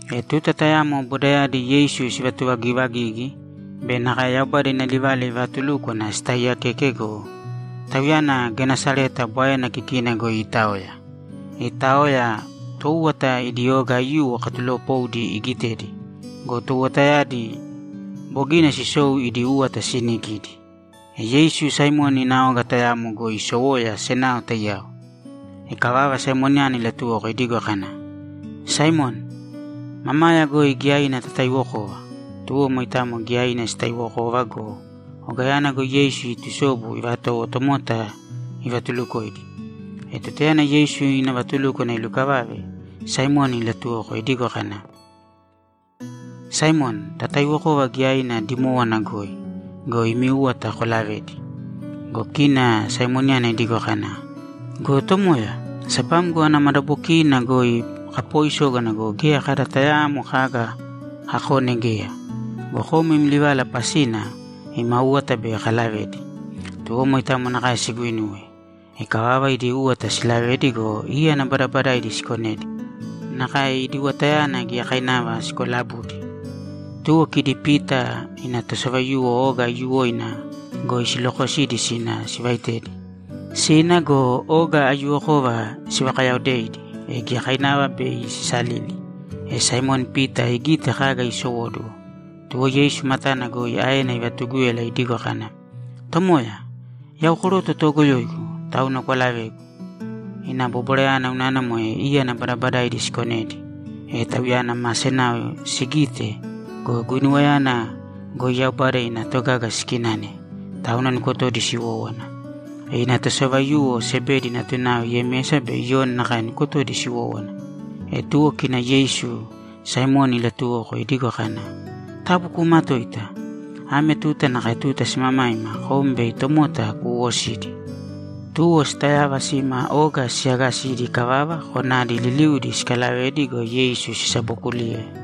E tuta tayamo bodayadi Yeisu sivatuvagivagigi be nakae Yaubada ina livala ivaatulúkwana sitaaiyakeke go, Tauyana Genesareta Bwaena kikina goi iitaoya. Iitaoya, toúwata idi oga aiyuwo katuloopoudi igitedi go, touwatayadi bogina sisou idi úwata siinikidi. E Yeisu Saimoni ina oga tayamo goi isowoya senao taiyao. Ikavava, Saimoniyana ilatuwoko idigo kana, ‘Saimoni, mamaya goi giyaina tataiwokōva.’ Tuwo moitamo giyaina sitaiwokova go, ogayana goi Yeisu itusobu ivatowo tomota ivatulukoidi. E tutayana Yeisu ina vatulúkwana ilukavave, Saimoni ilatuwoko idigo kana, ‘Saimoni, tataiwokōva giyaina dimowonina goi go, imi úwata kolavēdi.’ Go kina Saimoniyana idigo kana, ‘Go Tomoya, sabamgo ana madabokiina goi kapooisógana go, geya kada tayaamo kaga kakone geya. Go kom im livala pasina ima úwata bei kalavedi.’ Tuwo moe nakae siguinuwe. Ikavava, idi úwata silavedi go, íyana badabadaidi sikonedi. Nakae idi uwatayadi giyakainava sikolabudi. Tuwo kidi Pita ina tosavaiyuwo oga aiyuwoina goi silokosidi sina sivaitedi. Sina go, oga aiyuwokova sivakayaodeidi, e giyakainava bei sisalili. E Saimoni Pita igite kaga iisowóduwo, tuwo Yeisu matana goi aena ivatugúyala idigo kana, ‘Tomoya, yau koroto toogoyoigu, tauna kwalavēgu.’ Ina bobwarayana unana moe íyana badabadaidi sikonedi, e tauyana ma senao sigite go, guinuwayana goi Yaubada ina togaga sikinane, tauna nukotodi siwówana. E ina tosavaiyuwo Sebedi natunao Yemesa be Iyoni nakae nukotodi siwówana. E tuwo kina Yeisu Saimoni ilatuwoko idigo kana, ‘Taabu kuumatōita. Ame tuta nakae tuta simamaima kom bei tomota kuuwosidi!’ Tuwo sitayava sima oga siyagasidi ikavava, konadi liliudi sikalavedi go, Yeisu sisabokuliye.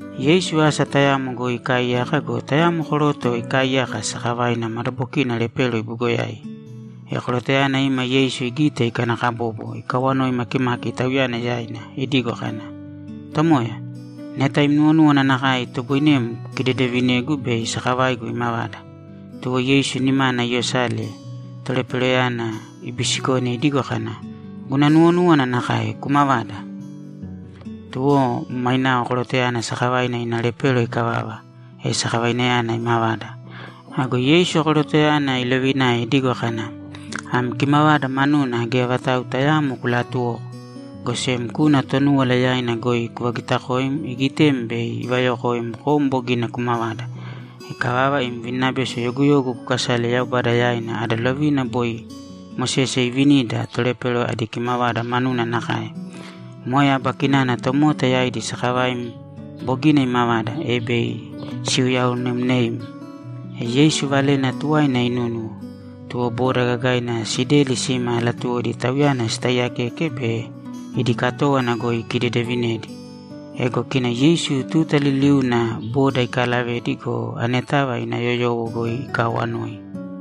Yeisu asa tayamo goi ikaaiyaka go, tayamo koroto ikaaiyaka, sakavaina madabokina lepero ibugoyai. E korotoyana ima Yeisu igite, ikanakabobo, ikawanoi makimaki Tauyana yaina idigo kana, ‘Tomoya, neta im nuwonúwana nakae, itoboinem kukidedevinegu bei sakavaigu imavada.’ Tuwo Yeisu nimana iyosale, toleperoyana ibisikone idigo kana, ‘Guna nuwonúwana nakae. Kumavāda!’ Tuwo mainao korotoyana sakavaina ina lepero ikavava, e sakavainayana imavada. Ago Yeisu korotoyana ilovinae idigo kana, ‘Am kimavada manuna geya vatau tayaamo kulaatuwōko, go sem kūna Tonúwala yaina goi kuvagitakōim igitem bei ivayokoim kom bogina kumavada. Ikavava, im vininabeso yoguyogu kukasāle Yaubada yaina ada lovina boi Mosese iivinida tolepero adi kimavada manuna nakae. Moe aba kinana tomota yaidi sakavaim bogina imavada, e bei siuyaonemneim.’ E Yeisu valena tuwaina inunúnuwo. Tuwo boda gagaina sideli sima latuwodi Tauyana sitaiyakeke be idi katówana goi ikidedevinedi. Ego kina Yeisu tuta liliuna boda ikaalavedi go, anetava ina yoyowo goi ikaawanoi.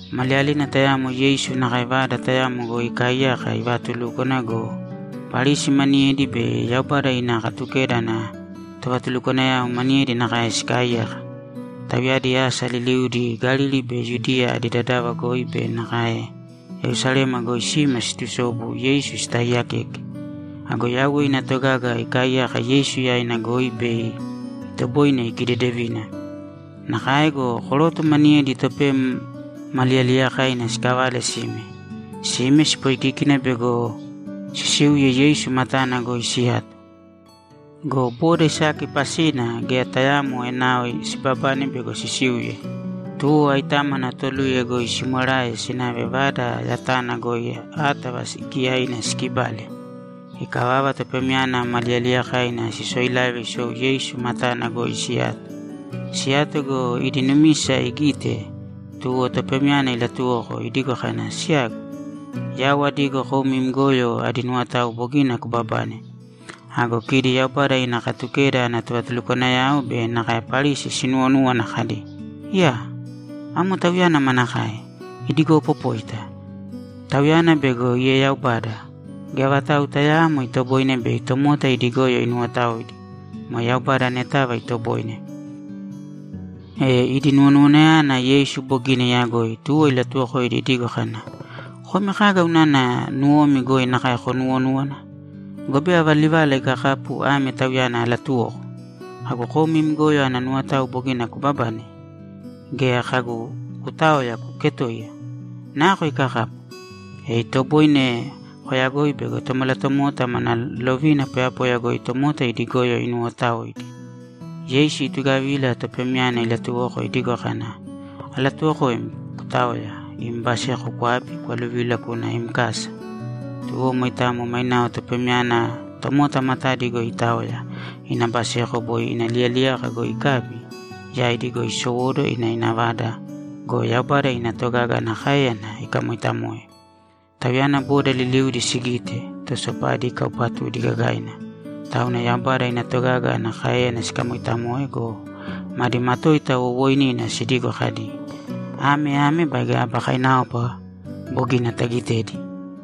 Maliyalina tayamo Yeisu nakae vada tayamo goi ikaaiyaka ivaatulúkwana go, Parisi maniyedi be Yaubada ina Katukeda ana tovatulukwanayao maniyedi nakae sikaaiyaka. Tauyadi asa liliudi Galili be Yudiya adi dadava goi be nakae Yerusalema goi sima siitusobu Yeisu sitaaiyakeke. Ago Yauwe ina togaga ikaaiyaka Yeisu yaina goi bei itoboine ikidedevina. Nakae go, koroto maniyedi topem ma liyaliyakaina sikavale sime. Sime sipoikíkina bego sisiuye Yeisu matana goi siyato go, boda isaki pasina geya tayaamo enao sibabane bego sisiuye. Tuwo aitámana toluye goi simwerae sinave vada yatana goi átava giyaina sikibale. Ikavava, topemyana ma liyaliyakaina sisoilave isou Yeisu matana goi siyato. Siyato go, idi numisa igite, tuwo topemyana ilatuwoko, idigo kana, ‘Siyagu, yau adigo kom im goyo adi nuwotao bogina kubabane.’ Ago kidi Yaubada ina Katukeda ana tovatulukwanayao be nakae Parisi sinuwonúwana kadi, ‘Iyaa! Amo Tauyana manakae! Idigopopóita! Tauyana bego ieyaubada! Geya vatau tayaamo itoboine bei tomota idi goyo inuwotaoidi. Moe Yaubada anetava itoboine.’ E idi nuwonuwanayana Yeisu bogina iyagoi, tuwo ilatuwokoidi idigo kana, ‘Komi kaga unana nuwomi goi nakae konuwonúwana? Gobe ava livala ikakapu ame tauyana alatuwoko? Kagu, “Kom im goyo ana nuwotao bogina kubabane!” Gea kagu, “Kutāoya, kuketōiya”? Nako ikakapu? E itoboine koyagoi bego Tomalatomota mana lovina poyapoya goi tomota idi goyo inuwootaoidi.’ Yeisu itugavila topemyana ilatuwoko idigo kana, ‘Alatuwokoim kutāoya, im baseko kwābi, kwaluvīla kūna im kasa!’ Tuwo moitamo mainao topemyana tomota matadi goi itaoya, ina baseko boi ina liyaliyaka goi ikabi, yaidi goi isowóduwo ina ina vada go, Yaubada ina togaga ana káeyana ikamooitamoe. Tauyana boda liliudi sigite, to sopadi ikaupatudi gagaina, tauna Yaubada ina togaga ana káeyana sikamoitamoe go, madi matoita wowooinina sidigo kadi, ‘Ame ame baige aba kainaopa bogina tagitedi!’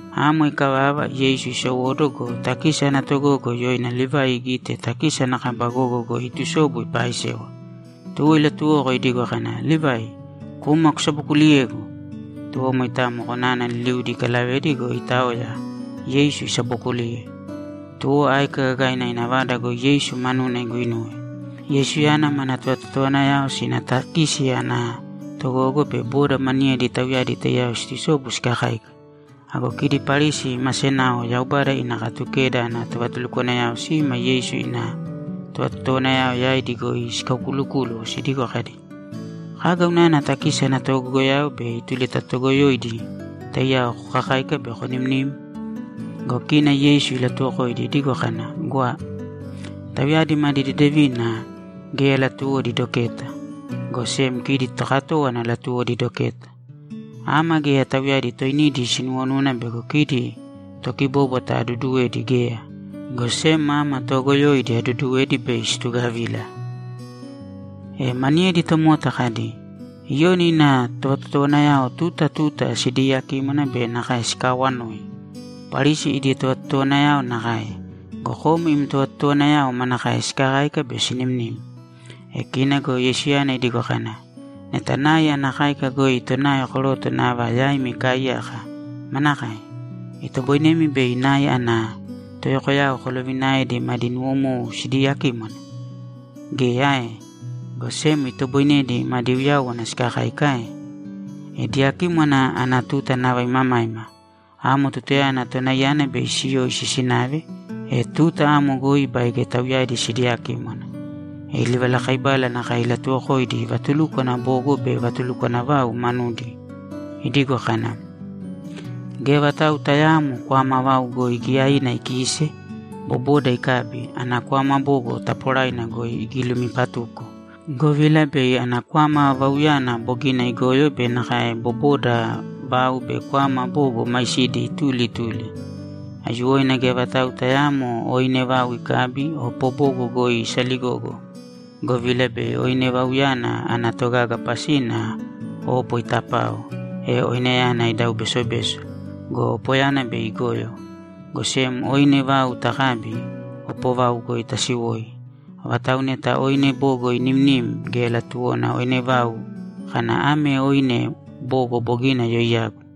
Amo ikavava, Yeisu isowóduwo go, takisi ana togogo yoina Livai igite takisi ana kaba gogo goi iitusobu ipaaisewa. Tuwo ilatuwoko idigo kana, ‘Livai, kūma kusabokuliyēgu!’ Tuwo moitamo konana liliudi ikalavedi go, itaoya, Yeisu isabookuliye. Tuwo áika gagaina ina vada goi Yeisu manuna iguinuwe. Yeisuyana mana tovatotowanayao sina takisi ana togogo be boda maniyedi tauyadi taiyao siitusobu sikakáika. Ago kidi Parisi ma senao Yaubada ina Katukeda ana tovatulukwanayao sima Yeisu ina tovatotowanayao yaidi goi sikaukulukúluwo, sidigo kadi, ‘Kaga unana takisi ana togogoyao be ituli ta toogoyoidi taiyao kokakáika be konimnim?’ Go kina Yeisu ilatuwokoidi idigo kana, ‘Gwa. Tauyadi madi deedevina geya latuwodi doketa, go sem kidi tokatówana latuwodi doketa. Ama geya tauyadi toinidi sinuwonúwana bego kidi tokibóbwata aduduwedi geya, go sem ama toogoyoidi aduduwedi bei situgavila.’ E maniyedi tomota kadi, ‘Iyoni ina tovatotowanayao tuta tuta sidiiyakímwana be nakae sikaawanoi. Parisi idi tovatotowanayao nakae. Go kom im tovatotowanayao manakae sikakáika be sinimnim?’ E kina go Yeisuyana idigo kana, ‘Neta nai ana káika goi tonai koroto nava yaimi ikaaiyaka, manakae? Itoboinemi bei nai ana toyokoyao kolovinaedi madi nuwomou sidiyakímwana? Geya ae? Go sem itoboinedi madi uyáwana sikakáika ae? E diyakímwana ana tuta nava imamaima. Amo tutayana tonaiyana bei siyoisi sinave, e tuta amo goi baige tauyadi sidiyakímwana.’ E livalakaibala nakae ilatuuwokoidi vatulukwana bogo be vatulukwana vau manudi idigo kana, ‘Geya vatau tayaamo kwama vau goi giyaina ikiise, boboda ikabi, ana kwama bogo taaporaina goi igilumipatuko, govila bei ana kwama vauyana bogina igoyo be nakae boboda vau be kwama bogo maisidi ituli ituli. Aiyuwoina geya vatau tayaamo oine vau ikabi, opo bogo goi isaligogo, govila bei oine vauyana ana togaga pasina opo itapao, e oineyana idau besobeso go, opoyana bei igoyo. Go sem oine vau takabi, opo vau goi tasiwoi. Avatau neta oine bogo inimnim, geya latuwona oine vau kana, “Ame oine bogo bogina yoiyagu.”’